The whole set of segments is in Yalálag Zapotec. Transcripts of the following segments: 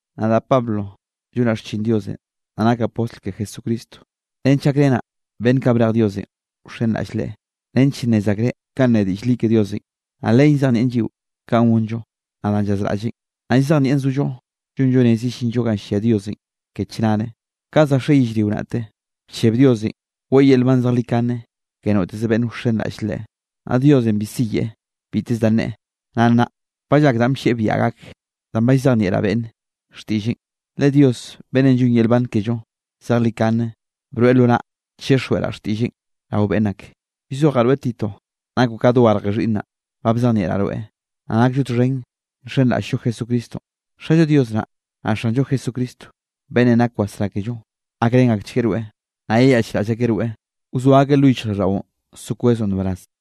Nadaꞌ Pablo llonaꞌ xchin Diosenꞌ, naꞌ nakaꞌ postl ke Jesucristo, nench gakrenaꞌ beꞌnn kaꞌ brej Diosenꞌ wxenraꞌll Leꞌe, nench nnez akreꞌ kanꞌ ne diꞌll li ke Diosenꞌ. Naꞌ len llzejnieꞌn lliꞌo kanꞌ gonllo, naꞌ danꞌ llazraꞌlleꞌn, naꞌ llzejnieꞌn zollo llonllo rez yellinllo ganꞌ llia Diosenꞌ ke chnare. Ka za xe yellrio naꞌte, bcheb Diosenꞌ weꞌe yel nban zejlikane ke noteze beꞌnn wxenraꞌll Leꞌe, naꞌ Diosenꞌ bi siyeꞌe biteze da neꞌe. Naꞌ nnaꞌ ba llak danꞌ bllieꞌ biaꞌa gak, danꞌ ba llzejnieꞌraꞌ beꞌnne xtiꞌlleꞌn, le Dios beꞌnnenꞌ llonn yel nban kello zejlikane broeꞌ lo naꞌ, chixjweꞌraꞌ xtiꞌlleꞌn rao beꞌnn ak. Llzojaꞌ rweꞌ Tito nakoꞌ ka dogarje xhiꞌnnaꞌn, ba bzejnieꞌraꞌ rweꞌ, naꞌ nakllo txhen nxenraꞌll-llo Jesucristonꞌ. Xallo Dios naꞌ, naꞌ Xanllo Jesucristo beꞌnn nak wasrá kello, gakrén akchgueꞌ rweꞌ, naꞌ yeyaꞌchraꞌll akeꞌ rweꞌ, wzoa akeꞌ lo yichjraꞌlldaꞌon so kwezoꞌ nbaraz.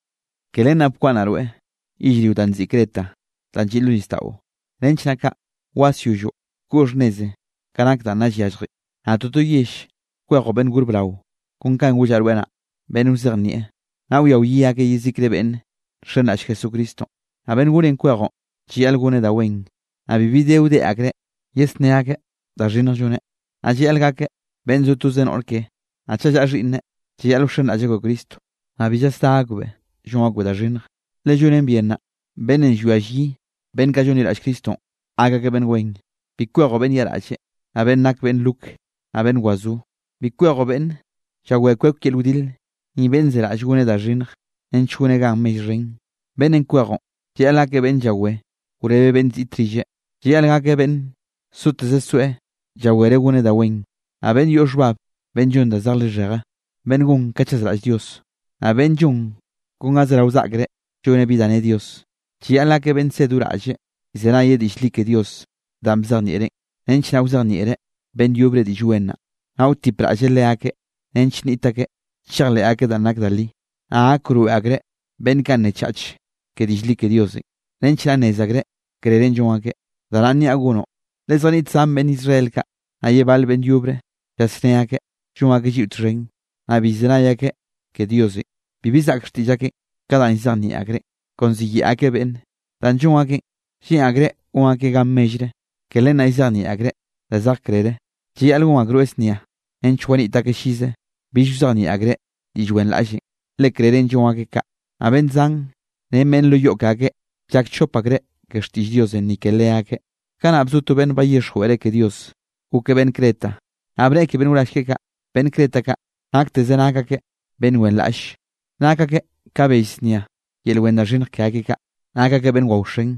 Ke len naꞌ bkwaꞌnnaꞌ rweꞌ yellrio danꞌ nziꞌi Creta, danꞌ lliꞌ lo nisdaꞌo, nench naꞌ kaꞌ wasyolloꞌ koꞌ xhnnezenꞌ ka nak danꞌ nna llyalljen, naꞌ toto yell kwejoꞌ beꞌnn gor brao, kon kanꞌ gollaꞌ rweꞌ naꞌ, beꞌnn wzejnieꞌ, naꞌ wia wyi akeꞌ yezikre beꞌnne nxenraꞌll Jesucristonꞌ. Naꞌ beꞌnn gorenꞌ kwejoꞌn, llayaꞌl goneꞌ da wen, naꞌ bibi de wdeꞌ akreꞌ yesné akeꞌ da xhinnje lloneꞌ, naꞌ llayaꞌl gakeꞌ beꞌnn zo toze noꞌr keꞌe, naꞌ chaꞌ llaꞌa xhiꞌnneꞌ, llayaꞌl wxenraꞌll akbeꞌ Cristo, naꞌ bi llasdá akbeꞌ llon akbeꞌ da xhinnje. Le llonen bien naꞌ, beꞌnnenꞌ llwia llyi beꞌnn kaꞌ llonliraꞌll Cristonꞌ, gak akeꞌ beꞌnn wen. Bi kwejoꞌ beꞌnn yaꞌraꞌlle, naꞌ beꞌnn nake beꞌnn rok, naꞌ beꞌnn wazó. Bi kwejoꞌ beꞌnne llawé kwek yel wdile, ni beꞌnn zeraꞌll goneꞌ da xhinnje, nench goneꞌ ganꞌ mell xhen. Beꞌnnenꞌ kwejoꞌn, llayaꞌl gakeꞌ beꞌnn llawé wrebeꞌ beꞌnn ziꞌt rilleꞌ. Llayaꞌl gakeꞌ beꞌnn zoteze zoeꞌ llawereꞌ goneꞌ da wen, naꞌ beꞌnn yoꞌ xhbab, beꞌnn llon da zeje lixheje, beꞌnn gon ka chazraꞌll Dios, naꞌ beꞌnn llon kon ga zerao saꞌkre lloneꞌ bi da nne Dios. Llayaꞌl gakeꞌ beꞌnn ze do raꞌlleꞌ, llzenayeꞌ diꞌll li ke Dios danꞌ bzejnieꞌreꞌn, nench naꞌ wzejnieꞌreꞌ beꞌnn yobre Diꞌll Wen naꞌ, naꞌ wtipraꞌlleꞌ leakeꞌ nench nniꞌt akeꞌ chejleꞌ akeꞌ danꞌ nak da li, naꞌ gak wroeꞌ akreꞌ beꞌnn kaꞌ nne chach ke diꞌll li ke Diosenꞌ, nench naꞌ nnez akreꞌ krerenꞌ llon akeꞌ. Da naꞌn niaꞌ gonoꞌ, le zjaniꞌt zan beꞌnn Israel kaꞌ, naꞌ ye bale beꞌnn yobre llasné akeꞌ llon akeꞌ lliꞌo txhen, naꞌ bi llzenay akeꞌ ke Diosenꞌ. Bibi zaꞌk xtiꞌll akeꞌn ka danꞌ llzejnieꞌ akreꞌn, kon ziyeꞌe akeꞌ beꞌnne. Danꞌ llon akeꞌn, lleꞌn akreꞌ gon akeꞌ gan mellre, ke len naꞌ llzejnieꞌ akreꞌ da zej krere. Llayaꞌl gon akroeꞌ znia, nench waniꞌt akeꞌ llize bill wzejnieꞌ akreꞌ diꞌll wenraꞌllenꞌ, le krerenꞌ llon akeꞌ kaꞌ. Naꞌ beꞌnn zan, ren beꞌnn lo yoꞌ ke akeꞌ, llak chop akreꞌ ke xtiꞌll Diosenꞌ ni ke leakeꞌ. Kanaꞌ bzo to beꞌnn bayixjweꞌreꞌ ke Dios, gokeꞌ beꞌnn Creta, naꞌ bneꞌe ke beꞌnn wrall keꞌe kaꞌ: “Beꞌnn Creta kaꞌ nakteze nak akeꞌ beꞌnn wenraꞌlle, nak akeꞌ ka bell znia yel wen da xhinnj ke akeꞌ kaꞌ. Nak akeꞌ beꞌnn waoxen,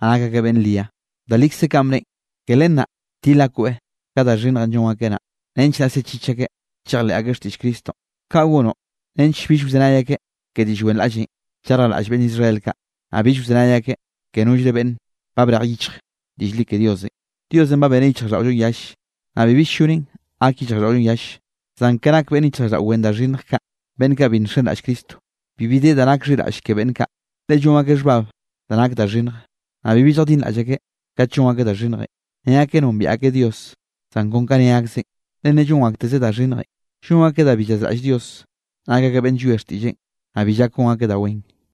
naꞌ nak akeꞌ beꞌnn ria.” Da likze kanꞌ bneꞌen. Ke len naꞌ til akoeꞌ ka da xhinnjenꞌ llon akeꞌ naꞌ, nench naꞌ sechich akeꞌ chejleꞌ akeꞌ xtiꞌll Cristonꞌ. Kaꞌ gonoꞌ nench bill wzenay akeꞌ ke diꞌll wenraꞌllenꞌ llarjlaꞌll beꞌnn Israel kaꞌ, naꞌ bill wzenay akeꞌ ke nollre beꞌnn ba brej yichj diꞌll li ke Diosenꞌ. Diosenꞌ ba beneꞌ yichjraꞌlldaꞌollonꞌ yalle, naꞌ bibi ll-llonen gak yichjraꞌlldaꞌollonꞌ yalle. Zan ka nak beꞌnn yichjraꞌlldaꞌo wen da xhinnj kaꞌ, beꞌnn kaꞌ bi nxenraꞌll Cristonꞌ, bibi de da nak xhiraꞌll ke beꞌnn kaꞌ. Le llon akeꞌ xhbab da nak da xhinnj, naꞌ bibi lljadinraꞌll akeꞌ kat llon akeꞌ da xhinnjenꞌ. Ne akeꞌ nombiaꞌ akeꞌ Dios, zan kon ka ne akzeꞌn, le ne llon aktezeꞌ da xhinnje. Llon akeꞌ da bi llazraꞌll Dios, nak akeꞌ beꞌnn llwie xtiꞌlleꞌn, naꞌ bi llak gon akeꞌ da wen.